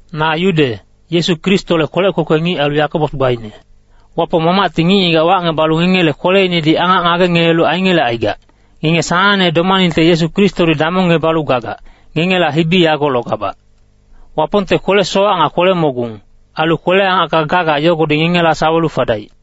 Na Yude, Yesu Kristole kwelec kwekwe ngic ailu Yakobos gbaine. Wapong Mamacti ngic-ngigac wacngebalu ngengele kweleinedi angac ngagengelelu aingelecaigac, ngenge sanangne domaningte Yesu Kristodi damongngebalu gagac, ngengela hibi yago logabac. Wapongte kwele-sowac nga kwele-mogung, ailu kwele-angacka gaga yogodi ngengela sawelu fadaic.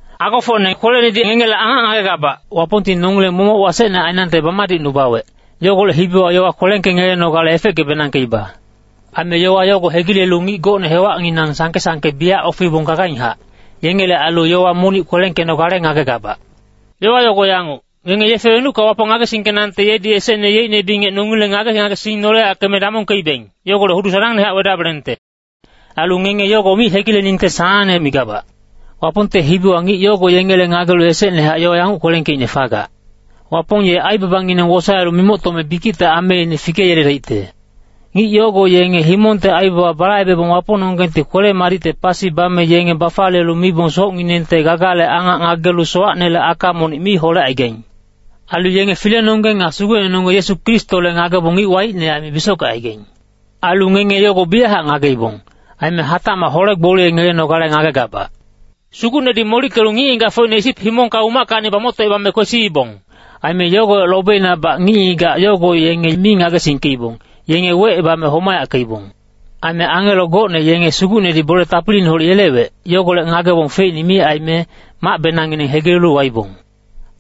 Agofocne kwelenedi ngengele angac ngagegabac, Wapongti nongileng momoc wasecne ainangte bamadicnubawec, yogolec hibiwa yowa kwelengkengelenogale efeckebenangkeiba. Aime yowa yogo hegilelu ngic gocne hewacnginang sangke-sangke biyac ofeibong gagainghac, yengele ailu yowa monic kwelengkenogale ngagegabac. Yowa yogo yanguc, ngenge yefe wenucka Wapong ngagesingkenangte yedi esecne yeicne bingec nongileng ngage-ngagesing noleyackeme damongkeibeng, yogolec hudu sanangnehac wedabelengte. Ailu ngenge yogo mi hegileningte sanangne migabac. Wapongte hibiwa ngic yogo yengele ngagelu esecnehac yowa yanguc kwelengkeicne fagac, “Wapong ye aibabangineng wosaelu mimoctome bikicte ameine fikeyeledaicte.” Ngic yogo yenge himongte aibaba balaibebong Wapongnonggengti kwele-madicte pasi bame yenge bafaliyelu mibong socnginengte gagale angac ngagelu sowacnele aka monic mi holecaigaing. Ailu yenge Filenonggeng nga Sugucnenonggeng Yesu Kristole ngagebong ngic waicne aime bisockecaigaing. Ailu ngenge yago biyachac ngageibong. Aime hatacmac hole-gboliyengelenogale ngagegabac. Sugucnedi molickelu ngic-ngigacfocine Isip himongka umackacni bamoctocebame kwesiibong. Aime yogolec lobeinabac ngic-ngigac yogo yenge mi ngagesingkeibong, yenge wecebame homayackeibong. Aime angelo gocne yenge Sugucnedi bole tapiliineholec yelewec, yogolec ngagebong feicne mi aime, macbenangngineng hegilelu waibong.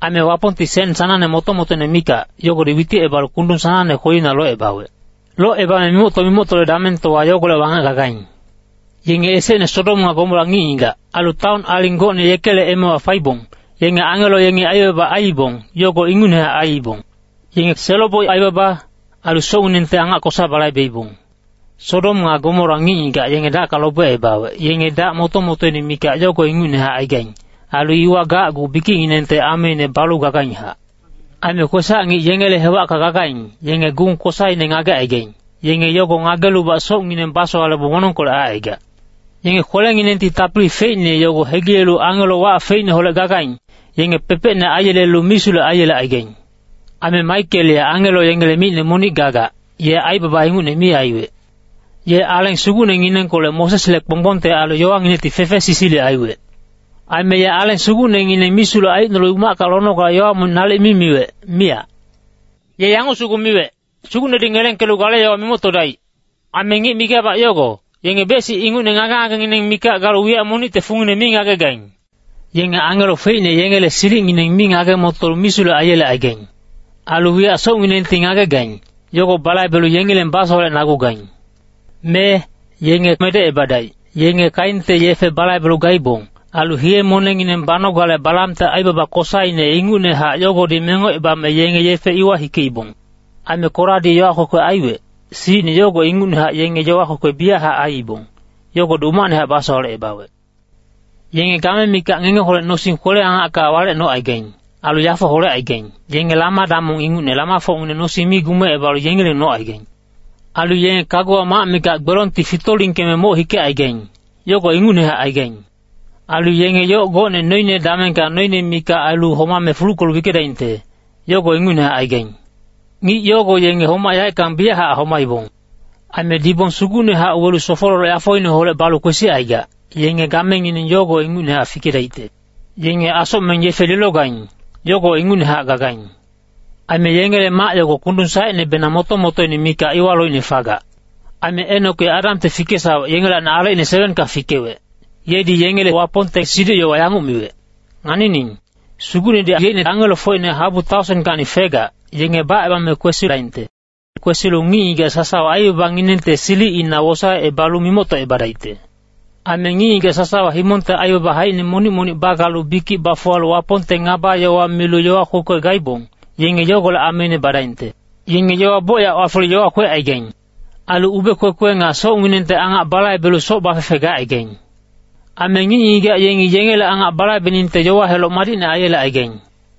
Aime Wapongti sen sanangne moto-motoine mikac, yogodi witicebalu kundung sanangne kwelina locebawec. Locebame mimocto-mimoctole damengtowa yogolec wangec gagaing. Yenge esecne Sodom nga Gomora ngic-ngigac, ailu taon aling gocne yekele emewa faibong, yenge angelo yengi aibaba aiibong, yogo ingucnehac aiibong. Yenge selo-boic aibaba, ailu socnginengte angac kosa balaibeibong. Sodom nga Gomora ngic-ngigac yenge dacka lobecebawec, yenge dac moto-motoine mikac yogo ingucnehac aigaing. Ailu iwa gacgu bikicnginengte ameine balu gagainghac. Aime kwesac-ngic yengele hewacka gagaing, yenge gung kosaine ngagecaigaing, yenge yogo ngagelubac socngineng basowalebong wonongkolec aicaigac. Yenge kwelenginengti tapili feicne yogo hegilelu angelo wac feicneholec gagaing, yenge pepecne aiyelelu misulec aiyelecaigaing. Aime Maikel ye angelo yengele micne monic gagac, ye aibaba ingucne mi aiwec. Ye Aleng Sugucnenginengkolec Mosesle kponggbongte ailu yowanginecti fefesisilic aiwec. Aime ye Aleng Sugucnengineng misulec aicnolu umacka lonogale yowa monic nalic mi miwec, miyac. Ye yanguc sugu miwec, “Sugucnedi ngelengkelu gale yowa mimoctodaic.” Aime ngic migabac yogo, yenge bec-sic ingucne ngage-ngagengineng mikac galu wiyac monicte fungine mi ngagegaing. Yenge angelo feicne yengele silicngineng mi ngage-motolu misulec aiyelecaigaing. Ailu wiyac socnginengti ngagegaing, yogo balaibelu yengileng basowalecnagugaing. Mee, yenge medecebadaic. Yenge Keinte yefe balaibelu gaibong. Ailu hiye-monengngineng banogale Balamte aibaba kosaine ingucnehac yogodi mengocebame yenge yefe iwa hikeibong. Aime Koradi yowa kwekwe aiwec, silicine yogo ingucnehac yenge yowa kwekwe biyachac aiibong, yogodi umacnehac basowalecebawec. Yenge game mikac ngengeholec nosing kwele-angacka walec nocaigaing. Ailu yafo holecaigaing, yenge lama-damong ingucne lamafocngineng nosing mi gumecebalu yengileng nocaigaing. Ailu yenge kaguwa mac mikac gbelongti fitolingkeme moc hikecaigaing, yogo ingucnehac aigaing. Ailu yenge yoc gocne noine damengka noine mikac ailu homame fuluckelu wickedaingte, yogo ingucnehac aigaing. Ngic yogo yenge homac yaeckang biyachac homaibong. Aime dibong sugucnehac welu sofololoc yafoineholec balu kwesicaigac, yenge gamengineng yogo ingucnehac fikedaicte. Yenge asocmeng yefe lilogaing, yogo ingucnehac gagaing. Aime yengele mac yogo kundung saecnebenang moto-motoine mikac iwa loicne fagac. Aime Enok ye Adamte fikesawec yengelacni alecine 7ka fikewec, yedi yengele Wapongte siduc-yowa yanguc miwec, “Nganining, Sugucnedi yeicne angelofocine habu taosenkacni fegac, yenge bacebame kwesidaingte. Kwesilu ngic-ngigac sasawa aibabanginengte silicina wosaecebalu mimoctocebadaicte. Aime ngic-ngigac sasawa himongte aibaba haicine monic-monic bagalu bikic bafuwalu Wapongte ngaba-yowa milu yowa kwekwe gaibong, yenge yogolec ameine badaingte.” Yenge yowa bocyac wafelu yowa kwecaigaing. Ailu ube-kwekwe nga socnginengte angac balaibelu soc bafefe gacaigaing. Aime ngic-ngigac yengi yengele angac balaibeningte yowa heloc madicne aiyelecaigaing.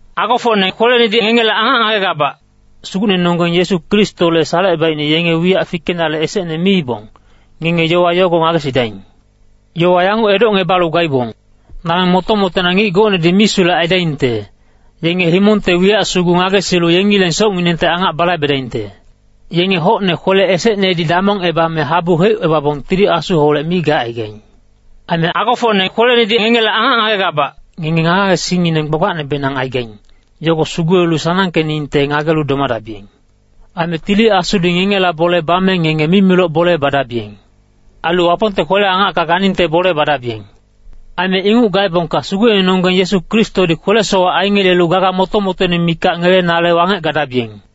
Agofocne kwelenedi ngengele angac ngagegabac, Sugucnenonggeng Yesu Kristole salecebaicne yenge wiyac fikenale esecne miibong, ngenge yowa yogo ngagesidaing. Yowa yanguc edocngebalu gaibong, “Dameng moto-motoina ngic gocnedi misulec aidaingte, yenge himongte wiyac sugu ngagesilu yengileng socnginengte angac balaibedaingte.” Yenge hocne kwele esecnedi damongebame habu heucebabong Tili Asuholec mi gacaigaing. Aime agofocne kwelenedi ngengele angac ngagegabac, ngenge ngage-ngagesingngineng gbagbacnebenang aigaing, yogo sugulelu sanangkeningte ngagelu domadabiyeng. Aime Tili Asudi ngengela bole bame ngenge mimiloc bole badabiyeng. Ailu Wapongte kwele-angacka ganingte bole badabiyeng. Aime inguc gaebongka Sugucnenonggeng Yesu Kristodi kwele-sowac aingelelu gaga moto-motoine mikac ngelenale wangec gadabiyeng.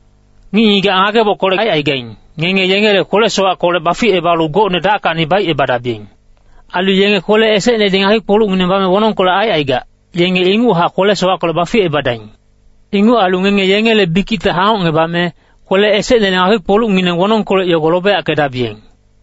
Ngic-ngigac ngagebockolec aicaigaing, ngenge yengele kwele-sowackolec baficebalu gocne dackacni baicebadabiyeng. Ailu yenge kwele esecnedi ngakpi-kpolucngineng bame wonongkolec aicaigac, yenge inguchac kwele-sowackolec baficebadaing. Inguc ailu ngenge yengele bikicte hangocngebame, kwele esecnele ngakpi-kpolucngineng wonongkolec yogo lobeyackedabiyeng.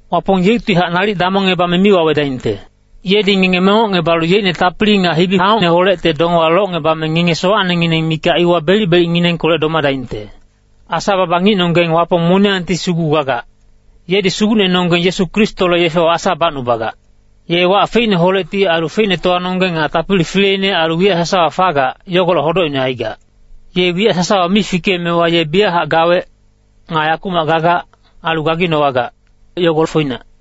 Wapong yeuctihac nalic damongngebame mi wawedaingte. Yedi ngenge mengocngebalu yeicne tapili nga hibi-angocineholecte dongewa locngebame ngenge sowacnengineng mikac iwa belic-belicnginengkolec domadaingte. Asa-baba ngicnonggeng Wapong moniyangti sugu gagac. Yedi Sugucnenonggeng Yesu Kristole yefewa Asa bacnubagac. Ye wac feicneholecti ailu feicnetowanonggeng nga tapili fileine ailu wiyac sasawa fagac, yogolec hodocine aigac. Ye wiyac sasawa mi fikeemewa ye biyachac gawec, nga yakumac gagac, ailu gaginowagac, yogo foinac.